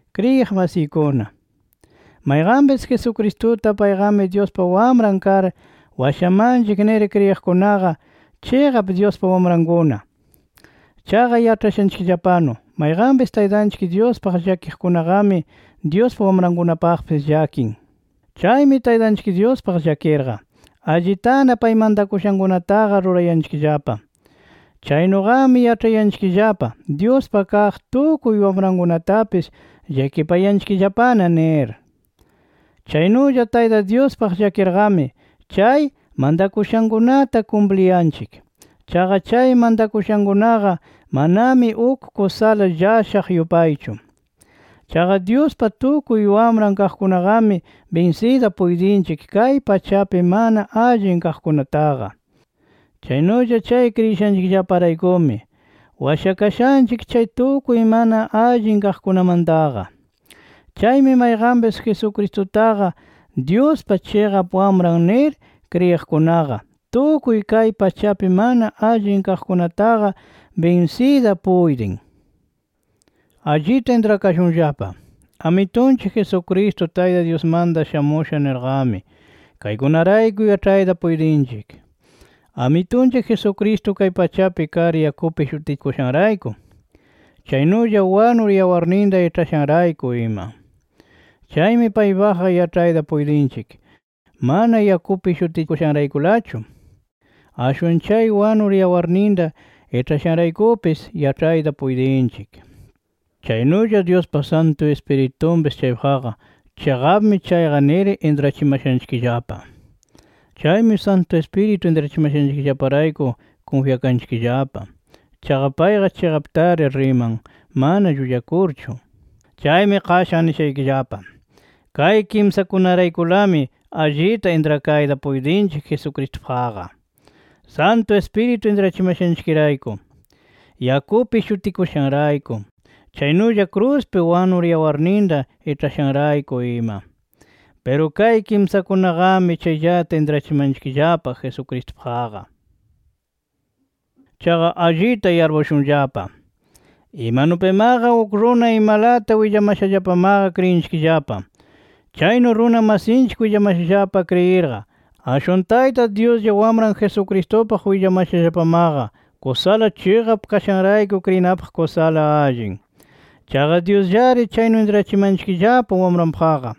Kriyiq masiykuna, mayqanpis Jesucristuta payqami Dyuspa Wamran kar washamanchik nir kriyiqkunaqa, chiqap Dyuspa wamrankuna. Chaqa yaĉhashanchikllapanu mayqanpis Taytanchik Dyuspaq llakiqkunaqami Dyuspa wamrankunapaqpis llakin. Chaymi Taytanchik Dyuspaq llakirqa, allitana pay mantakushankunataqa rurayanchikllapa. Chaynuqami yaĉhayanchikllapa Dyuspa kaq tukuy wamrankunatapis llakipayanchikllapana nir. Chaynulla Tayta Dyuspaq llakirqami, chay mantakushankunata kumpliyanchik. Chaqa chay mantakushankunaqa manami uk kusala llashaq yupaychu. Chaqa Dyuspa tukuy wamran kaqkunaqami binsiyta puytinchik kay pachapi mana allin kaqkunataqa. Chaynulla chay kriyishanchikraykumi washakashanchik chay tukuy mana allin kaqkunamantaqa. Chaymi mayqanpis Jesucristuqa Dyuspa chiqap Wamran nir kriyiqkunaqa, tukuy kay pachapi mana allin kaqkunataqa binsiyta puytin. Allita intrakashunllapa: Amitunchik Jesucristo Tayta Dyusmanta shamusha nirqami, kaykunarayku yaĉhayta puytinchik: Amitunchik Jesucristo kay pachapi kar yakupi shutikushanrayku, chaynulla wanur yawarninta iĉhashanrayku ima. Chaymi paypaqqa yaĉhayta puytinchik mana yakupi shutikushanraykulachu, ashwan chay wanur yawarninta iĉhashanraykupis yaĉhayta puytinchik. Chaynulla Dyuspa Santu Ispiritunpis chaypaqqa, chiqapmi chayqa nir intrachimashanchikllapa. Chaymi Santu Ispiritu intrachimashanchikllaparayku, kunfyakanchikllapa. Chaqa payqa chiqaptari riman, mana llullakurchu. Chaymi qashan nishaykillapa: Kay kimsakunaraykulami, allita intrakayta puytinchik Jesucristupaqqa: Santu Ispiritu intrachimashanchikrayku, yakupi shutikushanrayku, chaynulla kruspi wanur yawarninta iĉhashanrayku ima. Piru kay kimsakunaqami chayllata intrachimanchikllapa Jesucristupaqqa. Chaqa allita yarpushunllapa: Imanupimaqa uk runa imalata willamashallapamaqa kriyinchikllapa. Chaynu runa masinchik willamashallapa kriyirqa, ashwan Tayta Dyuslla Wamran Jesucristupaq willamashallapamaqa kusala chiqap kashanrayku kriyinapaqqa kusala allin. Chaqa Dyusllari chaynu intrachimanchikllapa Wamranpaqqa.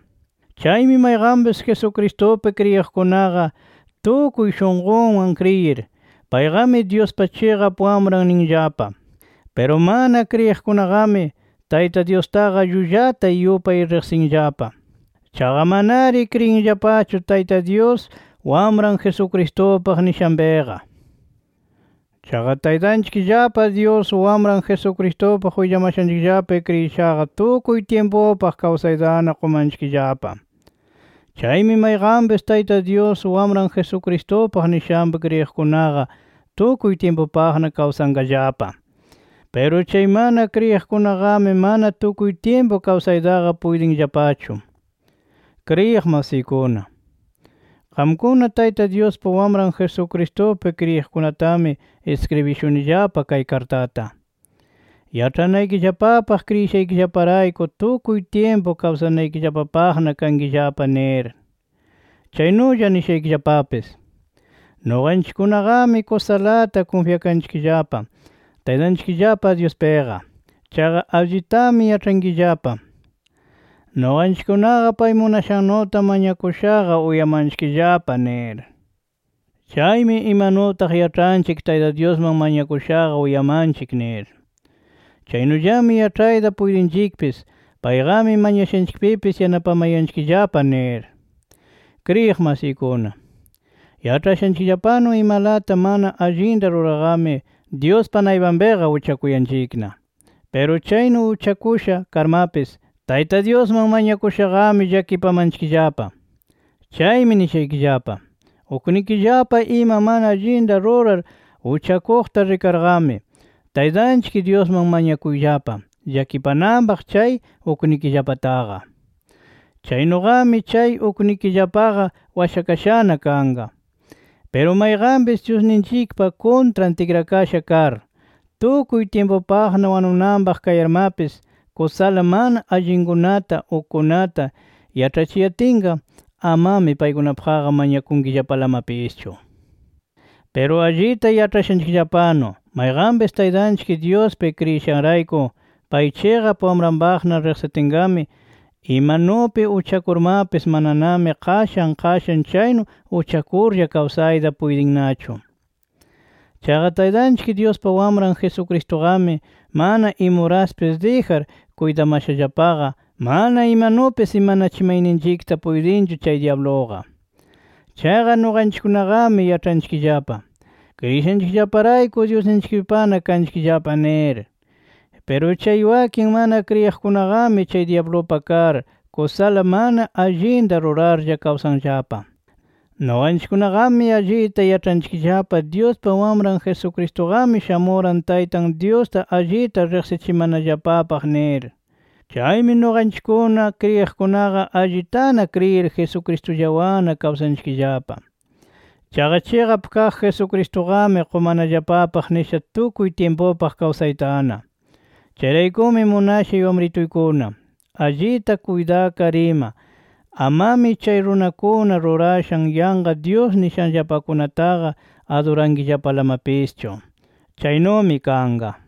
Chaymi mayqanpis Jesucristupi kriyiqkunaqa tukuy shunqunwan kriyir, payqami Dyuspa chiqap Wamran ninllapa. Piru mana kriyiqkunaqami, Tayta Dyustaqa llullata yupay riqsinllapa. Chaqa manari kriyinllapachu Tayta Dyus Wamran Jesucristupaq nishanpiqa. Chaqa Taytanchikllapa Dyus, Wamran Jesucristupaq willamashanchikllapapi kriyishaqa tukuy tyimpupaq kawsaytana qumanchikllapa. Chaymi mayqanpis Tayta Dyus, Wamran Jesucristupaq nishanpi kriyiqkunaqa tukuy tyimpupaqna kawsanqallapa. Piru chay mana kriyiqkunaqami mana tukuy tyimpu kawsaytaqa puytinllapachu. Kriyiq masiykuna, qamkuna Tayta Dyuspa Wamran Jesucristupi kriyiqkunatami iskribishunillapa kay kartata, yaĉhanaykillapapaq kriyishaykillaparayku tukuy tyimpu kawsanaykillapapaqna kankillapa nir. Chaynulla nishaykillapapis: Nuqanchikkunaqami kusalata kunfyakanchikllapa, Taytanchikllapa Dyuspiqa. Chaqa allitami yaĉhanchikllapa nuqanchikkunaqa pay munashannuta mañakushaqa uyamanchikllapa nir. Chaymi imanutaq yaĉhanchik Tayta Dyusman mañakushaqa uyamanchik nir, chaynullami yaĉhayta puytinchikpis payqami mañashanchikpipis yanapamayanchikllapa nir. Kriyiq masiykuna, yaĉhashanchikllapanu imalata mana allinta rurarqami Dyuspa naypanpiqa uchakuyanchikna. Piru chaynu uchakusha karmapis, Tayta Dyusman mañakushaqami llakipamanchikllapa. Chaymi nishaykillapa: Uknikillapa ima mana allinta rurar uchakuqta rikarqami, Taytanchik Dyusman mañakuyllapa llakipananpaq chay uknikillapataqa. Chaynuqami chay uknikillapaqa washakashana kanqa. Piru mayqanpis Dyusninchikpa kuntran tikrakasha kar, tukuy tyimpupaqna wanunanpaq kayarmapis, kusala mana allinkunata ukkunata yaĉhachiyatinqa, amami paykunapaqqa mañakunkillapalamapischu. Piru allita yaĉhashanchikllapanu mayqanpis Taytanchik Dyuspi kriyishanrayku, pay chiqap wamranpaqna riqsitinqami, imanupi uchakurmapis mananami qashan qashan chaynu uchakurlla kawsayta puytinnachu. Chaqa Taytanchik Dyuspa Wamran Jesucristuqami mana imuraspis dijar kuytamashallapaqa, mana imanupis imanachimayninchikta puytinchu chay dyabluqa. Chaqa nuqanchikkunaqami, yaĉhanchikllapa kriyishanchikllaparayku Dyusninchikpana kanchikllapa nir. Piru chay wakin mana kriyiqkunaqami chay dyablupa kar, kusala mana allinta rurarlla kawsanllapa. Nuqanchikkunaqami allita yaĉhanchikllapa Dyuspa Wamran Jesucristuqami shamuran Taytan Dyusta allita riqsichimanallapapaq nir. Chaymi nuqanchikkuna kriyiqkunaqa allitana kriyir Jesucristullawanna kawsanchikllapa. Chaqa chiqap kaq Jesucristuqami qumanallapapaq nisha tukuy tyimpupaq kawsaytana. Chayraykumi munashay wamrituykuna, allita kuytakar ima, amami chay runakuna rurashan yanqa dyus nishanllapakunataqa adurankillapalamapischu. Chaynumi kanqa.